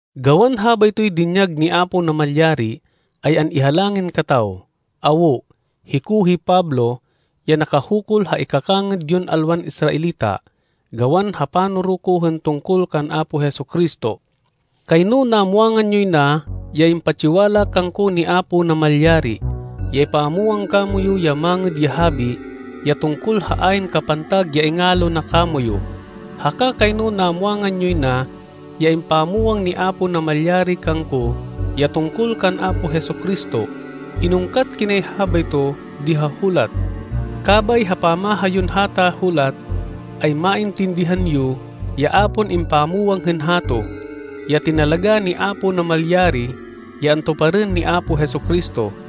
Gawan habaytoy dinyag ni Apo Namalyari, ay an-ihalangin kataw. Awo, hiko hi Pablo, ya nakahukul ha ikakangêd yon alwan Israelita, gawan ha panoro ko hên tungkol kan Apo Jesu-Cristo. Kayno namwangan yoy na ya impatsiwala kangko ni Apo Namalyari, ya ipamwang kamoyu ya Mangêd ya Habi, ya tungkol ha ayn kapantag ya ingalo na kamoyu. Haka kayno namwangan yoy na ya impamwang ni Apo Namalyari kangko ya tungkol kan Apo Jesu-Cristo. Inungkat kinay habayto, di ha hulat. Kabay ha pamaha yon hata hulat, ay maintindihan yo ya a pon impamwang hên hato, ya tinalagá ni Apo Namalyari, ya antuparên ni Apo Jesu-Cristo.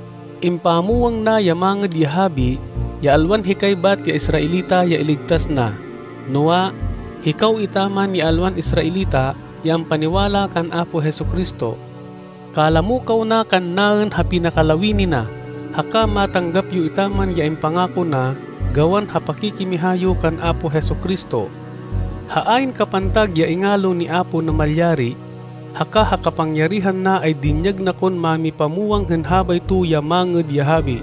Impamwang na ya Mangêd ya Habi, ya alwan hikay bat ya Israelita ya iligtas na, noa, hikaw etaman ya alwan Israelita ya ampaniwala kan Apo Jesu-Cristo. Kalamo kaw na kannaên ha pinakalawini na. Haka matanggap yo etaman ya impangako na gawan ha pakikimiha yo kan Apo Jesu-Cristo. Ha ayn kapantag ya ingalo ni Apo Namalyari, haka ha kapangyarihan na ay dinyag na kon mámipamwang hên habayto ya Mangêd ya Habi.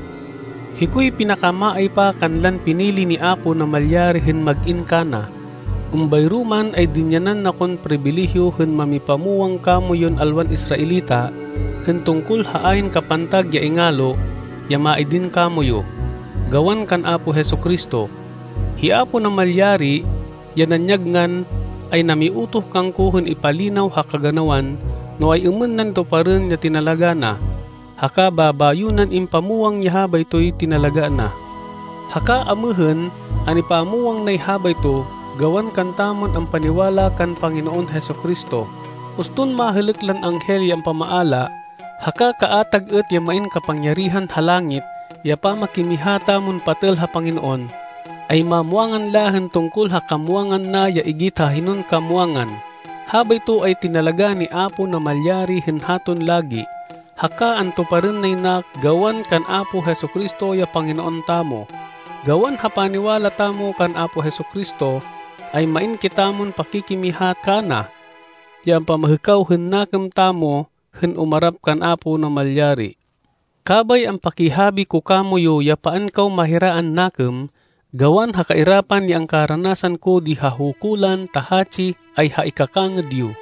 Hikoy pinakamaaypa kanlan pinili ni Apo Namalyari hên mag-in kana. Êmbayro man ay dinyanan na kon pribileyo hên mámipamwang kamoyun alwan Israelita hên tungkol ha ayn kapantag ya ingalo ya maidin kamoyu, gawan kan Apo Jesu-Cristo. Hi Apo Namalyari, ya nanyag ngan, ay namiutoh kangko hên ipalinaw ha kaganawan no ay-êmên nan tuparên ya tinalagá na, haka babayo nan impamwang ya habaytoy tinalagá na. Haka amêhên an-ipamwang nay habayto, gawan kantamon ampaniwala kan Panginoon Jesu-Cristo. Uston mahêlêk lan anghel ya ampamaala, haka kaatag êt ya main kapangyarihan ha langit ya pamakimiha tamon patêl ha Panginoon, ay mamwangan la hên tungkol ha kamwangan na ya igit ha hinon kamwangan. Habayto ay tinalagá ni Apo Namalyari hên haton lagi, haka antuparên nay na gawan kan Apo Jesu-Cristo ya Panginoon tamo. Gawan ha paniwala tamo kan Apo Jesu-Cristo, ay main kitamon pakikimiha kana ya ampamahêkaw hên nakêm tamo hên umarap kan Apo Namalyari. Kabay ampakihabi ko kamoyu ya paan kaw mahiraan nakêm gawan ha kairapan ya angkaranasan ko di ha hukulan ta hatsi ay ha ikakangêd yo.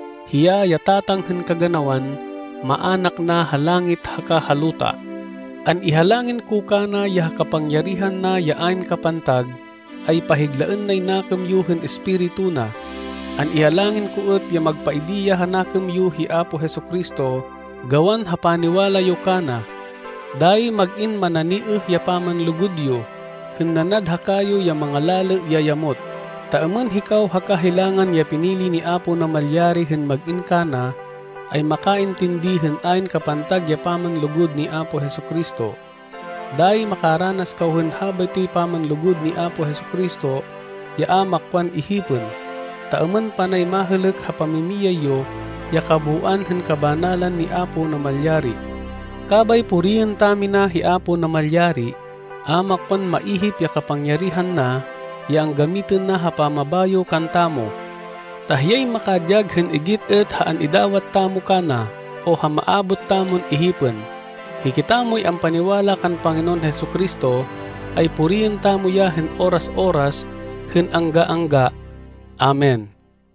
Hiya ya Tatang hên kaganawan maának na ha langit haka ha luta. An-ihalangin ko kana ya ha kapangyarihan na ya ayn kapantag, ay pahiglaên nay nakêm yo hên Espiritu na. An-ihalangin ko êt ya magpaidi ya ha nakêm yo hi Apo Jesu-Cristo gawan ha paniwala yo kana. Dayi mag-in mananiêh ya pamanlugud yo, hên nanad ha kayo ya mangalalê ya yamot, ta êmên hikaw haka hilangan ya pinili ni Apo Namalyari hên mag-in kana, ay makaintindi hên ayn kapantag ya pamanlugud ni Apo Jesu-Cristo. Dayi makaranas kaw hên habaytoy pamanlugud ni Apo Jesu-Cristo ya a makwan ihipên, ta êmên panay mahêlêk ha pamimiyay yo ya kabooan hên kabanalan ni Apo Namalyari. Kabay puriên tamina hi Apo Namalyari. A makwan maihip ya kapangyarihan na ya anggamitên na ha pamabayo kantamo. Ta hiyay makadyag hên igit êt ha an-idawat tamo kana o ha maabot tamon ihipên. Hikitamoy ampaniwala kan Panginoon Jesu-Cristo, ay puriên tamo ya hên oras-oras hên angga-angga. Amen.